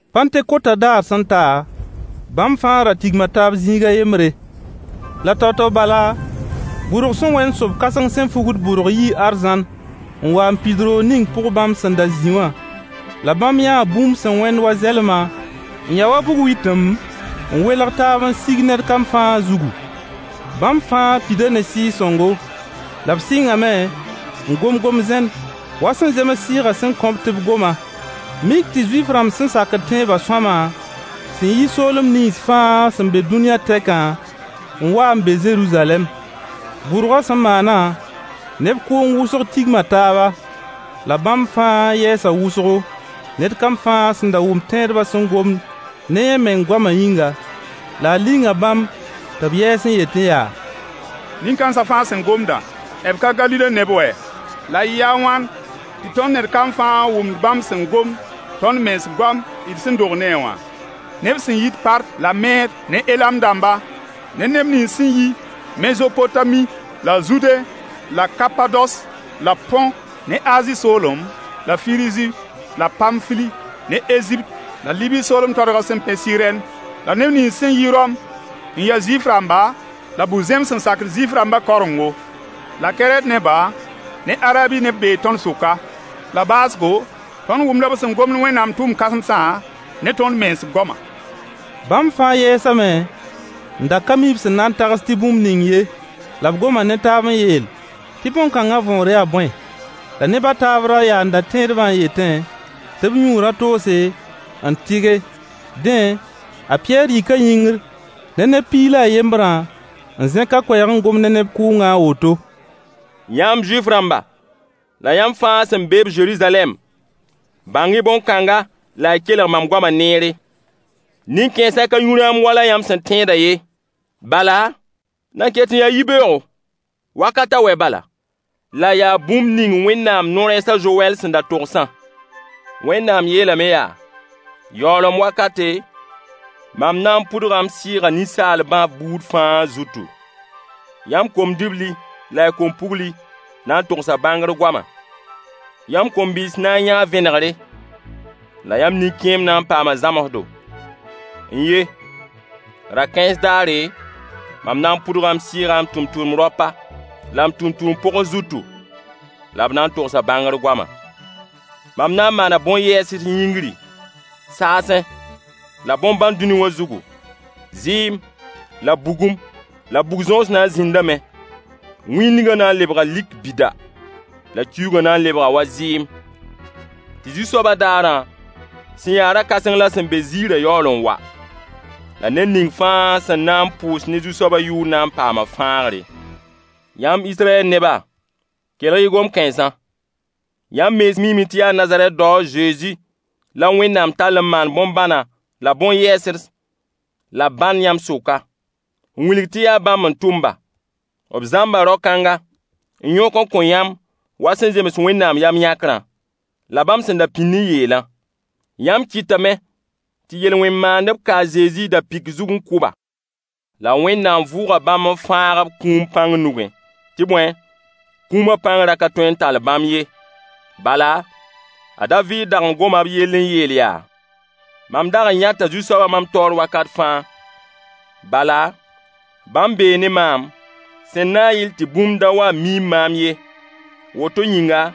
Pãntekotã daar sẽn ta, bãmb fãa ra tigma taab zĩig a yembre. La tao-tao bala, bʋrg sẽn wẽnd sob-kãseng sẽn fugd bʋrg yii arzãn n wa n pid roog ning pʋg bãmb sẽn da zĩ wã. La bãmb yãa bũmb sẽn wẽnd wa zɛlma, n ya wa bug-witim, n welg taab n sig ned kam fãa zugu. Bãmb fãa pida ne Sɩɩg-sõngo. La b sɩngame n gom gom-zẽn wa sẽn zems Sɩɩgã sẽn kõ-b tɩ b goma. Mik tɩ Zuif-rãmb sẽn sakd tẽebã sõama, sẽn yi soolem nins fãa sẽn be dũniyã tɛkã, n wa n be Zeruzalɛm. Bʋrgã sẽn maanã, neb kʋʋng wʋsg tigma taaba. La bãmb fãa yɛɛsa wʋsgo, ned kam fãa sẽn da wʋmd tẽedbã sẽn gomd ne yẽ meng goama yĩnga. La a linga bãmb tɩ b yɛɛs n yetẽ yaa: Nin-kãensa fãa sẽn gomdã, b ka Galile neb wɛ? La yɩɩ a wãn tɩ tõnd ned kam fãa wʋmd bãmb sẽn gomd tõnd mens goam d sẽn dog ne a wã? Neb sẽn yit Part la Meed ne Elam dãmba, ne neb nins sẽn yi Mezopotami la Zude la Kapados la Põ ne Azi soolem, la Firzi la Pamfili ne Ezipt la Libi soolem toadgã sẽn pẽ Sɩrɛn. La neb nins sẽn yi Rom n ya Zuif-rãmba la bu-zẽms sẽn sakd Zuif-rãmba kaorengo, la Kɛrɛt neba ne Arabi neb bee tõnd sʋka. La baoosgo tõnd wʋmda b sẽn gomd Wẽnnaam tʋʋm kãsmsã ne tõnd mens goama! Bãmb fãa yɛɛsame n da ka mi b sẽn na tags tɩ bũmb ning ye. La b goma ne taab n yeel tɩ bõn-kãngã võor yaa bõe. La neb a taab ra yaanda tẽedbã n yetẽ tɩ b yũu rã-toose n tɩge. Dẽ, a Pɩyɛɛr yika yĩngr ne neb piig la a yembrã n zẽk a koɛɛg n gom ne neb kʋʋngã a woto: Yãmb Zuif-rãmba, la yãmb fãa sẽn be-b Zeruzalɛm, bãng-y bõn-kãnga la y kelg mam goama neere. Nin-kãensã ka yũ rãam wala yãmb sẽn tẽedã ye. Bala, nan ket n yaa yibeoogo, wakat a wɛ bala. La yaa bũmb ning Wẽnnaam no-rɛɛs a Zowɛl sẽn da togsã: “Wẽnnaam yeelame yaa: Yaoolem wakate, mam na n pʋdga m Sɩɩgã ninsaalbã buud fãa zutu. Yãmb kom-dibli la y kom-pugli na n togsa bãngr goama. Yãmb kom-bɩɩs na n yãa vẽnegre, la yãmb nin-kẽemb na n paama zãmsdo. N ye! Ra-kãens daare, mam na n pʋdga m Sɩɩgã m tʋmtʋmd-raopa la m tʋmtʋmd-pogs zutu, la b na n togsa bãngr goama. Mam na n maana bõn-yɛɛsds yĩngri, saasẽ, la bõn-bãn dũniyã zugu, zɩɩm, la bugum, la bug-zõos na n zĩndame. Wĩndgã na n lebga lik bida, la kiuugã na n lebga wa zɩɩm, tɩ Zu-soabã daarã sẽn ya ra-kãseng la sẽn be ziirã yaool n wa. La ned ning fãa sẽn na n pʋʋs ne Zu-soaba yʋʋr na n paama fãagre.” Yãmb Israyɛl neba, kelg-y gom-kãensã. Yãmb mens miime tɩ yaa Nazarɛt dao a Zezi la Wẽnnaam tall n maan bõn-bãnã la bõn-yɛɛsds la bãn yãmb sʋka, n wilg tɩ yaa bãmb n tʋm-ba. B zãmba rao-kãnga, n yõk n kõ yãmb wa sẽn zems Wẽnnaam yam-yãkrã, la bãmb sẽn da pĩnd n yeelã. Yãmb kɩtame tɩ yel-wẽn maandb ka a Zezi da-pɩk zug n kʋ-ba. La Wẽnnaam vʋʋga bãmb n fãag-b kũum pãng nugẽ. Tɩ bõe, kũumã pãng ra ka tõe n tall bãmb ye. Bala, a Daviid dag n goma b yell n yeel yaa: “Mam dag n yãta Zu-soaba mam taoor wakat fãa. Bala, bãmb bee ne maam, sẽn na n yɩl tɩ bũmb da wa n miim maam ye. Woto yĩnga,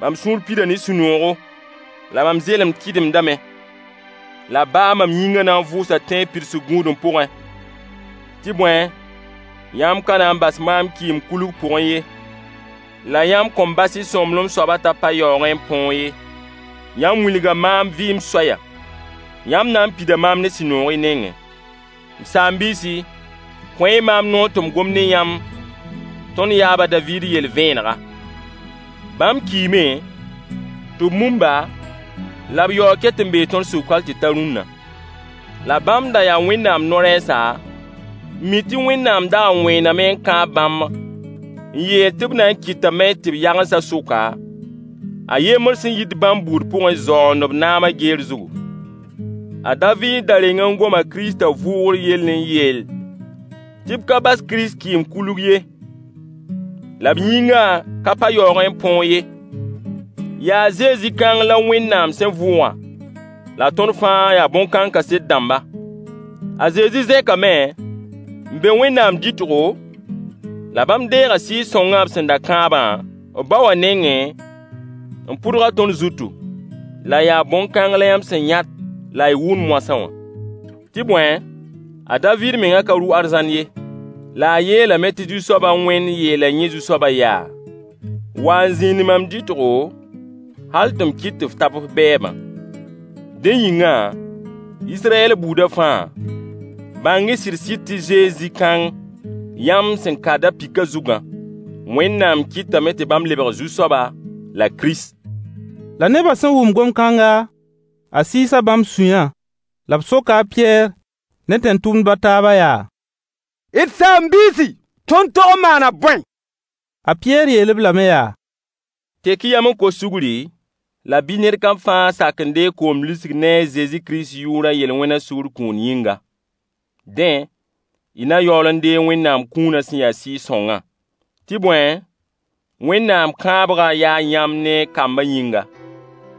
mam sũur pida ne sũ-noogo, la mam zelemd kɩdemdame. La baa mam yĩngã na n vʋʋsa tẽeb pidsg gũudem pʋgẽ. Tɩ bõe, yãmb ka na n bas maam kɩɩm-kulg pʋgẽ ye, la yãmb kõn bas y sõmblem soabã t'a pa yaoogẽ n põog ye. Yãmb wilga maam vɩɩm soaya: Yãmb na n pida maam ne sũ-noog y nengẽ.” M saam-biisi, kõ-y maam noor tɩ m gom ne yãmb tõnd yaab a Daviid yell vẽenega: Bãmb kiime, tɩ b mum-ba, la b yaoog ket n bee tõnd sʋk hal tɩ ta rũnna. La bãmb da yaa Wẽnnaam no-rɛɛsa, n mi tɩ Wẽnnaam dag n wẽename n kãab bãmb n yeel tɩ b na n kɩtame tɩ b yagensa sʋka, a yembr sẽn yit bãmb buud pʋgẽ zaoond b naama geer zugu. A Daviid da reng n goma Kiristã vʋʋgr yell n yeel tɩ b ka bas Kirist kɩɩm-kulg ye, la b yĩngã ka pa yaoogẽ n põog ye. Yaa Zezi kãng la Wẽnnaam sẽn vʋʋgã, la tõnd fãa yaa bõn-kãng kaset dãmba. A Zezi zẽkame n be Wẽnnaam dɩtgo, la bãmb deega Sɩɩg-sõngã b sẽn da kãabã, b ba wã nengẽ, n pʋdg-a tõnd zutu. La yaa bõn-kãng la yãmb sẽn yãt la y wʋmd moasã wã. Tɩ bõe, a Daviid meng ka rʋ arzãn ye, la a yeelame tɩ Zu-soab a Wẽnd yeela yẽ Zu-soaba yaa: “Wa n zĩnd mam dɩtgo, hal tɩ m kɩt tɩ f tab f bɛɛbã.” Dẽ yĩngã, Israyɛl buudã fãa, bãng-y sɩd-sɩd tɩ Zezi kãng yãmb sẽn ka da-pɩkã zugã, Wẽnnaam kɩtame tɩ bãmb lebg Zu-soaba la Kirist. La nebã sẽn wʋm gom-kãnga, a sɩɩsa bãmb sũyã. La b soka a Pɩyɛɛr ne tẽn-tʋmdba a taabã yaa: D saam-biisi, tõnd tog n maana bõe? A Pɩyɛɛr yeel-b lame yaa: Tek-y yam n kos sugri, la bɩ ned kam fãa sak n deeg koom lisg ne a Zezi Kirist yʋʋr a yel-wẽna sugr kũun yĩnga. Dẽ, y na yaool n deeg Wẽnnaam kũuna sẽn ya Sɩɩg-sõngã. Tɩ bõe, Wẽnnaam kãabgã yaa yãmb ne y kamb yĩnga,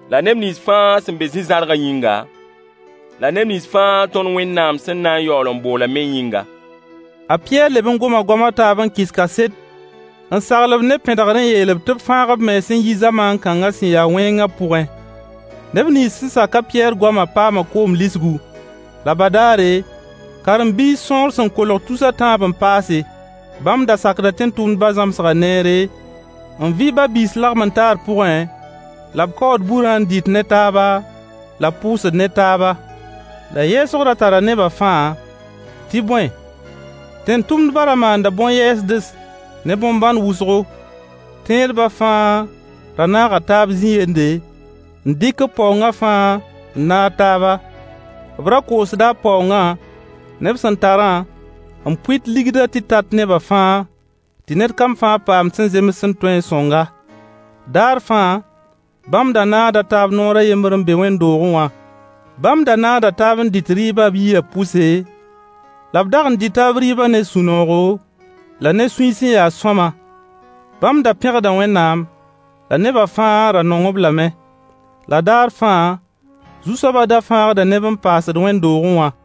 la neb nins fãa sẽn be zĩ-zãrgã yĩnga, la neb nins fãa tõnd Wẽnnaam sẽn na n boolã me yĩnga. A Pɩyɛɛr leb n goma goam a taab n kɩs kaset n sagl-b ne pẽdgr n yeel-b tɩ b fãag b mens n yi zamaan kãnga sẽn ya wẽngã pʋgẽ. Neb nins sẽn sak a Pɩyɛɛr goama paama koom lisgu. La badaare, karen-biis sõor sẽn kolg tus a tãab n paase. Bãmb da sakda tẽn-tʋmdba zãmsga neere, n vɩ ba-biis lagem-n-taar pʋgẽ, la b kaood burã n dɩt ne taaba, la b pʋʋsd ne taaba. La yɛɛsg ra tara neba fãa, tɩ bõe, tẽn-tʋmdbã ra maanda bõn-yɛɛsds ne bõn-bãn wʋsgo. Tẽedba fãa ra naaga taaba zĩ-yende, n dɩk b paoongã fãa n naag taaba. B ra koosda b paoongã ne b sẽn tarã n pʋɩt ligdã tɩ tat neba fãa, tɩ ned kam fãa paamd sẽn zemsd sẽn tõe sõng-a. Daar fãa, bãmb da naagda taab noor a yembr n be wẽnd-doogẽ wã. Bãmb da naagda taab n dɩt rɩɩbã b yiyã pʋse, la b dag n dɩta b rɩɩbã ne sũ-noogo, la ne sũy sẽn ya sõama. Bãmb da pẽgda Wẽnnaam. La neba fãa ra nong-b lame. La daar fãa, Zu-soabã da fãagda neb n paasd wẽnd-doogẽ wã.